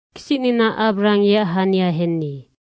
Kisicnina Abrahang yeac hania henni.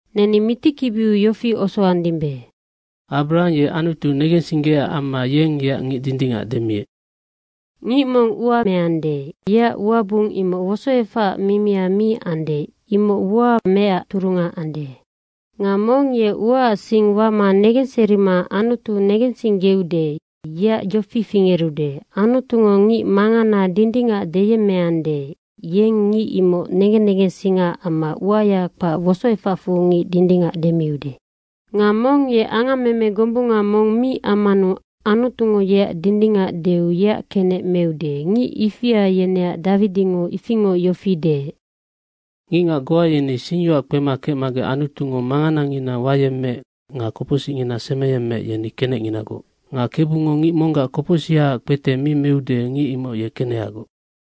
Neni mitikibiu yofi osoandimbe, “Abrahang ye Anutu negensinggeecac amma, yeng yeac ngic dindingac demiec.” Ngic mong ua meande, yeac uabung imoc wosoefacac mimia mi ande, imoc ua meecac turunga ande. Nga mong ye uaac sing wama negenserima Anutu negensinggeude, yeac yofi fingerude, Anutungo ngic mangana dindingac deyemmeande, yeng ngic imoc negen negensingaac amma uaya kpac wosoefacfu ngic dindingac demiude. Nga mong ye angammeme gombunga mong mi ammanu Anutungo yeac dindingac deu yeac kenec meude, ngic ifia yeneac Dawidingo ifingoc yofi deec, “Ngicngac goa yeni singyoac kpema kecmagec Anutungo manganangina wayemmeec nga kopocsicngina semeyemmeec, yeni kenecnginagoc. Nga KEBUNGO ngic monggac kopocsihaac kpete mi meude, ngic imoc ye kenehagoc.”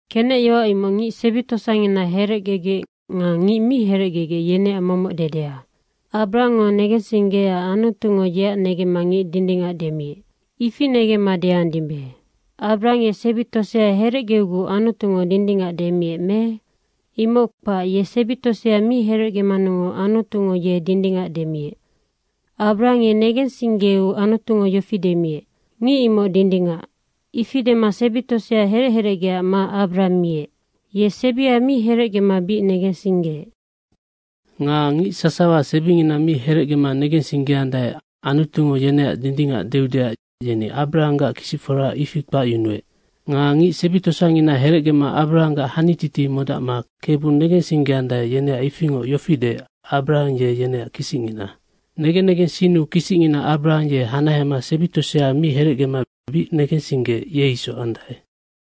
Kenec yoac, imoc ngic sebi tosangina herecgegec nga ngic mi herecgegec yeneac momoc dedea. Abrahangngo negensinggeecac Anutungo yeac negemma ngic dindingac demiec, ifinoc negemma deandimbe. Abrahang ye sebi tosea herecgeuguc Anutungo dindingac demiec me? Imoc kpac, ye sebi tosea mi herecgemanungoc Anutungo ye dindingac demiec. Abrahang ye negensinggeu Anutungo yofi demiec, “Ngic imoc dindingac.” ifi dema sebi tosea herec herecgeac ma Abrahang miec. Ye sebia mi herecgema bic negensinggeec. Nga ngic sasawa sebingina mi herecgema negensinggeandae, Anutungo yeneac dindingac deudeac yeni Abrahanggac kisicfora, ifi kpacyunuec. Nga ngic sebi tosangina herecgema Abrahanggac hanititi modacma Kebu negensinggeandae, yeneac ifingoc yofi deec, Abrahang ye yeneac kisicngina. Negen negensinnu kisicngina Abrahang, ye hanahema sebi tosea mi herecgema bic negensinggeec, ye isoc andae.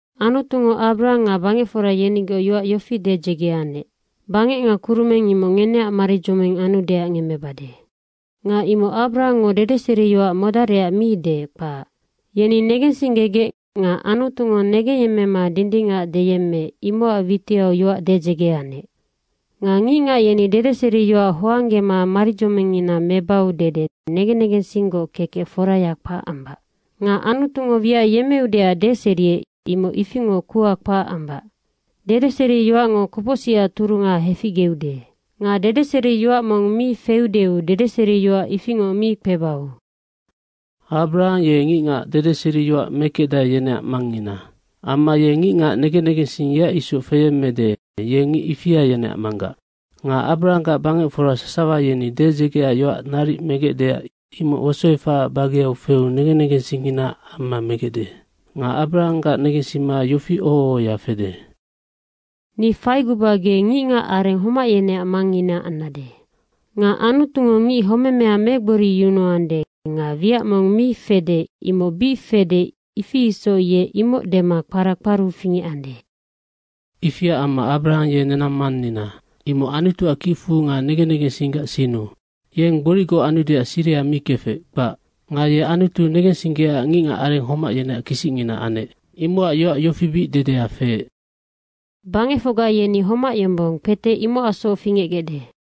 Anutungo Abrahang nga bangecfora yenigoc yoac yofi dedzege anec, bangec nga kurumeng imoc ngeneac maridzoming anudeac ngemmebade. Nga imoc Abrahangngo dedeseriyoac modarecac mi deec, kpac. Yeni negensinggegec nga Anutungo negengyemmema dindingac deyemmeec, imocac witiau yoac dedzege anec. Nga ngicngac yeni dedeseriyoac hoanggema maridzomingngina mebau dede negen negensinggoc kekec foraya kpac ambac. Nga Anutungo wiac yemmeudeac deseriec, imoc ifingoc kuha kpac ambac. Dedeseriyoacngo kopocsicac turunga heficgeude nga dedeseriyoac mong mi feudeu dedeseriyoac ifingoc mi kpebau. Abrahang ye ngicngac dedeseriyoac mekecdae, yeneac mangngina. Amma ye ngicngac negen negensing yeac isoc feyemmede, ye ngic ifia, yeneac manggac. Nga Abrahanggac bangecfora sasawa yeni dedzegeac yoac naric megecdeac imoc wosoefacac bageau feu negen negensingnginaac amma megecde. Nga Abrahanggac negensima yofi oho ohoya fede, “Ni faiguba ge ngicngac areng homac yeneac mangngina annade.” Nga Anutungo ngic homemea megboriyunuande nga wiac mong mi fede, imoc bic fede, ifi isoc ye imoc dema kpara kparu fingecande. Ifiac amma Abrahang ye nenang mannina, imoc Anutuac kicfu nga negen negensinggac sinnu. Yeng gboricgoc anudeac siriha mi kefec, kpac. Nga ye Anutu negensinggeecac ngicngac areng homac yeneac kisicngina anec. Imocacnoc yoac yofi bic dedea feec, “Bangecfocga yeni homac yombong, kpete imocacsoc fingecgecde.”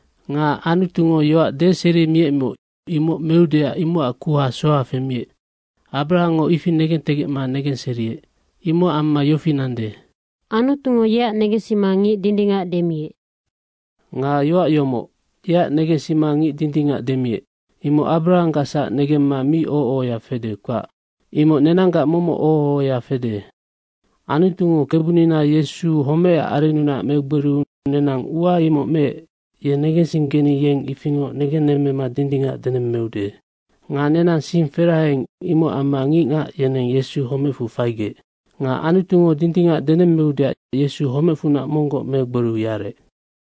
Nga Anutungo yoac deserimiecmoc imoc meudeac imocac kuha soha femiec, Abrahangngo ifi negentegecma negenseriec. Imocac amma yofi nande, “Anutungo yeac negensima, ngic dindingac demiec.” Nga yoac yomoc, “Yeac negensima ngic dindingac demiec.” imoc Abrahanggacsac negemma mi oho ohoya fede, kpac. Imoc nenanggac momoc oho ohoya fede. Anutungo Kebunina Yesu homecac arennunac megboriu nenang ua imoc meec, ye negensinggeni yeng ifingoc negennemmema dindingac denemmeude. Nga nenang sing feraheing, imocac amma ngicngac yeneng Yesu homecfu faigec. Nga Anutungo dindingac denemmeudeac Yesu homecfunac monggoc megboriu yarec.